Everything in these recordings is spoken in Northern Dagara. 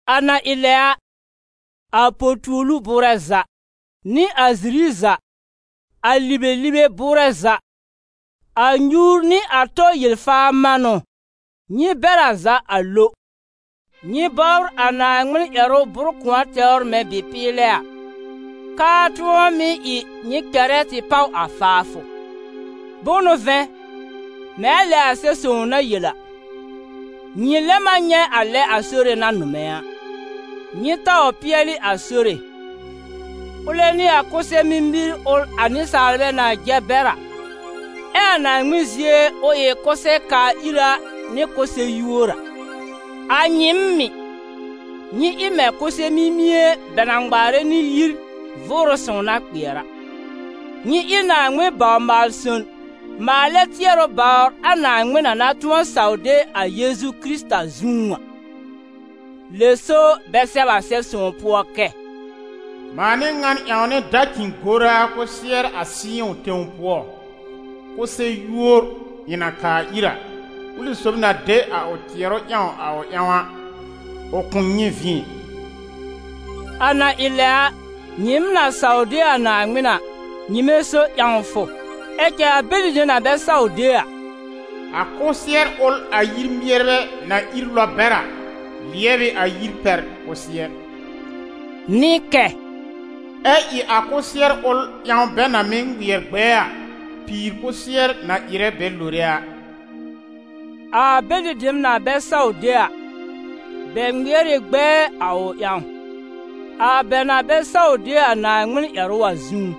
A na ɩ lɛ a, a potuolu bʋʋrɛ za, nɩ a ziri za, a libelibe bʋʋrɛ za, a nyuur nɩ a tɔ yel-faar manʋ, nyɩ bɛr a za a lo. Nyɩ bɔbr a Naaŋmɩn ƴɛrʋ bʋr-kʋ̃ɔ tɛwr mɛ̃ bɩ-pɩɩlɛ a, k'ʋʋ tʋ̃ɔ mɩ́ ɩ nyɩ kɛrɛ tɩ páw a faafʋ. Bʋ̃ʋ n'ʋ vɛ̃, Mɛ̃ a lɛ a Sɛb-sõw na yel a: «Nyɩ lɛm a nyɛ̃ a lɛ a Sore na nʋmɛ̃ a.» Nyɩ taw pɩɛlɩ a Sore: ʋlɛ n'ɩ a kʋsɛ-mimir ʋl a nɩsaalbɛ na jɛ bɛr a, ɛ a Naaŋmɩn zie ʋ ɩ kʋsɛ-kaa-ira nɩ kʋsɛ-yúor a. A nyɩɩm mɩ̀, nyɩ ɩ mɛ̃ kʋsɛ-mimie bɛ na ŋmaarɛ nɩ yir Vʋʋrʋ Sõw na kpɩɛr a; nyɩ ɩ Naaŋmɩn baw-maal-son maalɛ tɩɛrʋ bawr a Naaŋmɩn na na tʋ̃ɔ saw de a Yeezu Kɩrɩta zũú a. Lɛ so bɛ sɛb a Sɛb-sõw pʋɔ kɛ: «Mãa n'ɩ ŋa n ƴãwnɛ dacĩ-goraa kʋsɩɛr a Sɩyɔ̃ tẽw pʋɔ, kʋsɛ-yúor ɩ̃ na kaa ir a, ʋlɩ sob na de a ʋ tɩɛrʋ ƴãw a ʋ ƴãw a, ʋ kʋ̃ nyɛ̃ vĩ ɛ.» A na ɩ lɛ a, nyɩɩm na saw de a Naaŋmɩn a, nyɩmɛ so ƴãwfʋ; ɛ cɛ a bɛlɩ dem na bɛ saw de a, «A kʋsɩɛr ʋl a yir-mɩɛrbɛ na ír lɔb bɛr a, lɩɛb ɩ a yir pɛr kʋsɩɛr,» nɩ kɛ: «Ɛ ɩ a kʋsɩɛr ʋl ƴãw bɛ na mɩ́ ŋmɩɛr gbɛɛ a, pìir kʋsɩɛr na ɩrɛ bɛ lore a.» A bɛlɩ dem na bɛ saw de a, bɛ ŋmɩɛr ɩ gbɛɛ a ʋ ƴãw, a bɛ na bɛ saw de a Naaŋmɩn ƴɛrʋ a zũú.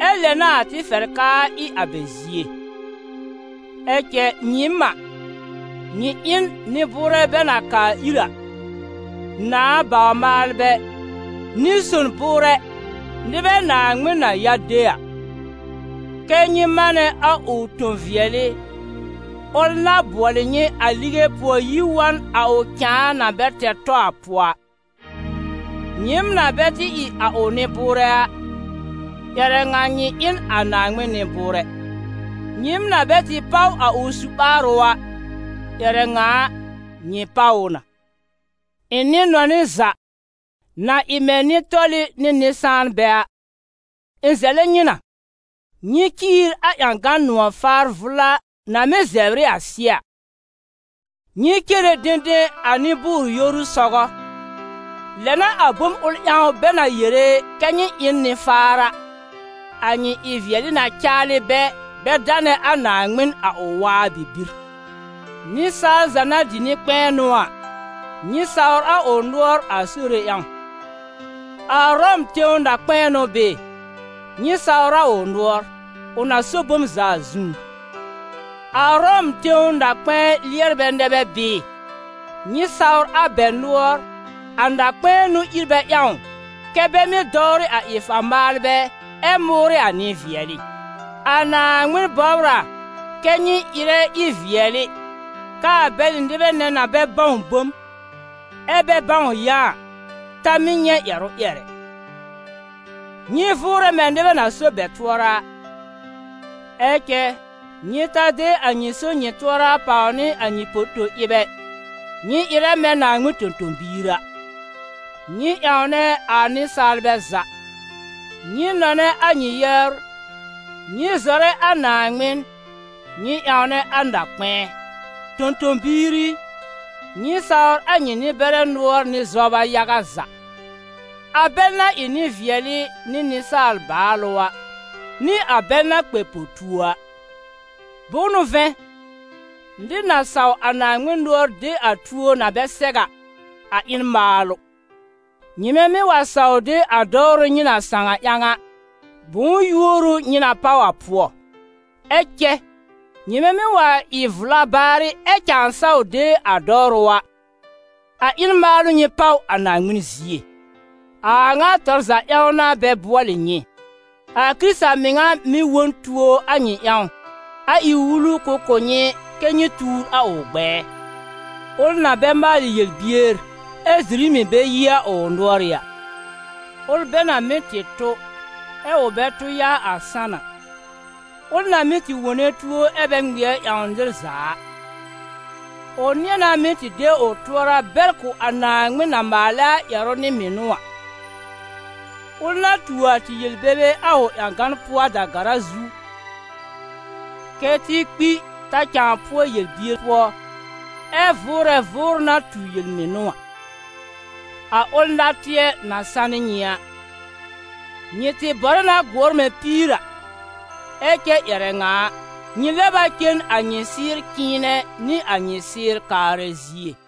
Ɛ lɛ n'a a tɩ fɛr k'aa ɩ a bɛ zie. Ɛ cɛ nyɩɩm a, nyɩ ɩ n «Nɩ-bʋʋrɛ bɛ na kaa ir a, Nãà bawr-maalbɛ, nɩ-son bʋʋrɛ, nɩbɛ Naaŋmɩn na ya de a», kɛ́ nyɩ manɛ a ʋ tõ-vɩɛlɩ, ʋl na bʋɔlɩ nyɩ a lige pʋɔ yi wa n a ʋ cãa na bɛ tɛr tɔ a pʋɔ a. Nyɩɩm na bɛ tɩ ɩ a ʋ nɩ-bʋʋrɛ a, ƴɛrɛ ŋa nyɩ ɩ n a Naaŋmɩn nɩ-bʋʋrɛ; nyɩɩm na bɛ tɩ páw a ʋ su-ɓaarʋ a, ƴɛrɛ ŋa a, nyɩ páw ʋ na. Ɩ̃ nɩ-nɔnɩ za, na ɩ mɛ̃ nɩ-tɔlɩ nɩ nɩ-sãanbɛ a, ɩ̃ zɛlɛ nyɩ na, nyɩ ciir a ƴãgan nʋ̃ɔ̀-faar vʋla na mɩ́ zɛbr ɩ a sɩ́ɛ a. Nyɩ cere dẽdẽ a nɩ-bʋʋr-yoru sɔgɔ, lɛ n'a a bom ʋl ƴãw bɛ na yere kɛ́ nyɩ ɩ n nɩ-faar a, a nyɩ ɩ-vɩɛlɩ na caalɩ bɛ, bɛ danɛ a Naaŋmɩn a ʋ waa bibir. Nɩsaal za na dɩ nɩ-kpɛ̃ɛnʋ a, nyɩ sawr a ʋ nʋɔr a Sore ƴãw: a Ʋrɔm tẽw na-kpɛ̃ɛ n'ʋ bɩɩ, nyɩ sawr a ʋ nʋɔr, ʋ na so bom za a zũú. A Ʋrɔm tẽw na-kpɛ̃ɛ lɩɛrbɛ nɛ bɛ bɩɩ, nyɩ sawr a bɛ nʋɔr, a na-kpɛ̃ɛ n'ʋ ír bɛ ƴãw kɛ́ bɛ mɩ́ dɔwrɩ a ɩ-faa maalbɛ ɛ mʋʋrɩ a nɩ-vɩɛlɩ. A Naaŋmɩn bɔbr a kɛ́ nyɩ ɩrɛ ɩ-vɩɛlɩ, k'aa bɛlɩ nɩbɛ nɛ na bɛ bãw bom, ɛ bɛ bãw yã a, ta mɩ́ nyɛ̃ ƴɛrʋ ƴɛr ɛ. Nyɩ vʋʋrɛ mɛ̃ nɩbɛ na so bɛ tʋɔra a, ɛ cɛ nyɩ ta de a so-nyɩ-tʋɔra pàw nɩ a nyɩ poto-ɩb ɛ, nyɩ ɩrɛ mɛ̃ Naaŋmɩn tõ-tõ-biir a. Nyɩ ƴãwnɛ a nɩsaalbɛ za, nyɩ nɔnɛ a nyɩ yɛbr, nyɩ zɔrɛ a Naaŋmɩn, nyɩ ƴãwnɛ a na-kpɛ̃ɛ. Tõ-tõ-biir i, nyɩ sawr a nyɩ nɩ-bɛrɛ nʋɔr nɩ zɔba yaga za, a bɛl na ɩ nɩ-vɩɛlɩ nɩ nɩsaal-baalʋ a, nɩ a bɛl na kpɛ po-tuo a. Bʋ̃ʋ n'ʋ vɛ̃, nɩr na saw a Naaŋmɩn nʋɔr de a tuo na bɛ sɛw a, a ɩ n maalʋ. Nyɩmɛ mɩ́ wa saw de a dɔwrʋ nyɩ na sãw a ƴãw a, bʋ̃ʋ yúor ʋ nyɩ na páw a pʋɔ? Ɛ cɛ nyɩmɛ mɩ́ wa ɩ vla baar ɛ cãa saw de a dɔwrʋ a, a ɩ n maalʋ nyɩ páw a Naaŋmɩn zie. A a ŋa tɔr za ƴãw n'a bɛ bʋɔlɩ nyɩ. A Kɩrɩta mɩŋa mɩ̀ wõ n tuo a nyɩ ƴãw, a ɩ wulu ʋ kʋ̀ nyɩ kɛ́ nyɩ tuur a ʋ gbɛɛ, ʋl na bɛ maalɩ yel-bier, ɛ ziri mɩ̀ bɛ yi a ʋ nʋ̀ɔrɩ́ a; ʋl bɛ na mɩ́ tɩ tʋ, ɛ ʋ bɛ tʋ yaa a sãn a; ʋl na mɩ́ tɩ wone tuo ɛ bɛ ŋmɩɛr ƴãwn nɩr za a. Ʋ nɩ̃ɛ na mɩ́ tɩ de ʋ tʋɔra bɛr kʋ̀ a Naaŋmɩn na maalɛ a ƴɛrʋ nɩ mɩnʋ a; ʋl na tuo a tɩ yel-bebe a ʋ ƴãgan pʋɔ a da-gara zu, kɛ́ tɩ kpi ta cãa pʋɔ yel-bier pʋɔ, ɛ vʋʋrɛ vʋʋrʋ na tu yel-mɩnʋ a; a ʋl natɩɛ na sanɩ nyɩ a. Nyɩ tɩ bɔrɛ na gʋɔr mɛ̃ píir a, ɛ cɛ ƴɛrɛ ŋa a, nyɩ lɛb a cen a nyɩ sɩ́ɩr cɩ̃ɩnɛ nɩ a nyɩ sɩ́ɩr kaarɛ zie.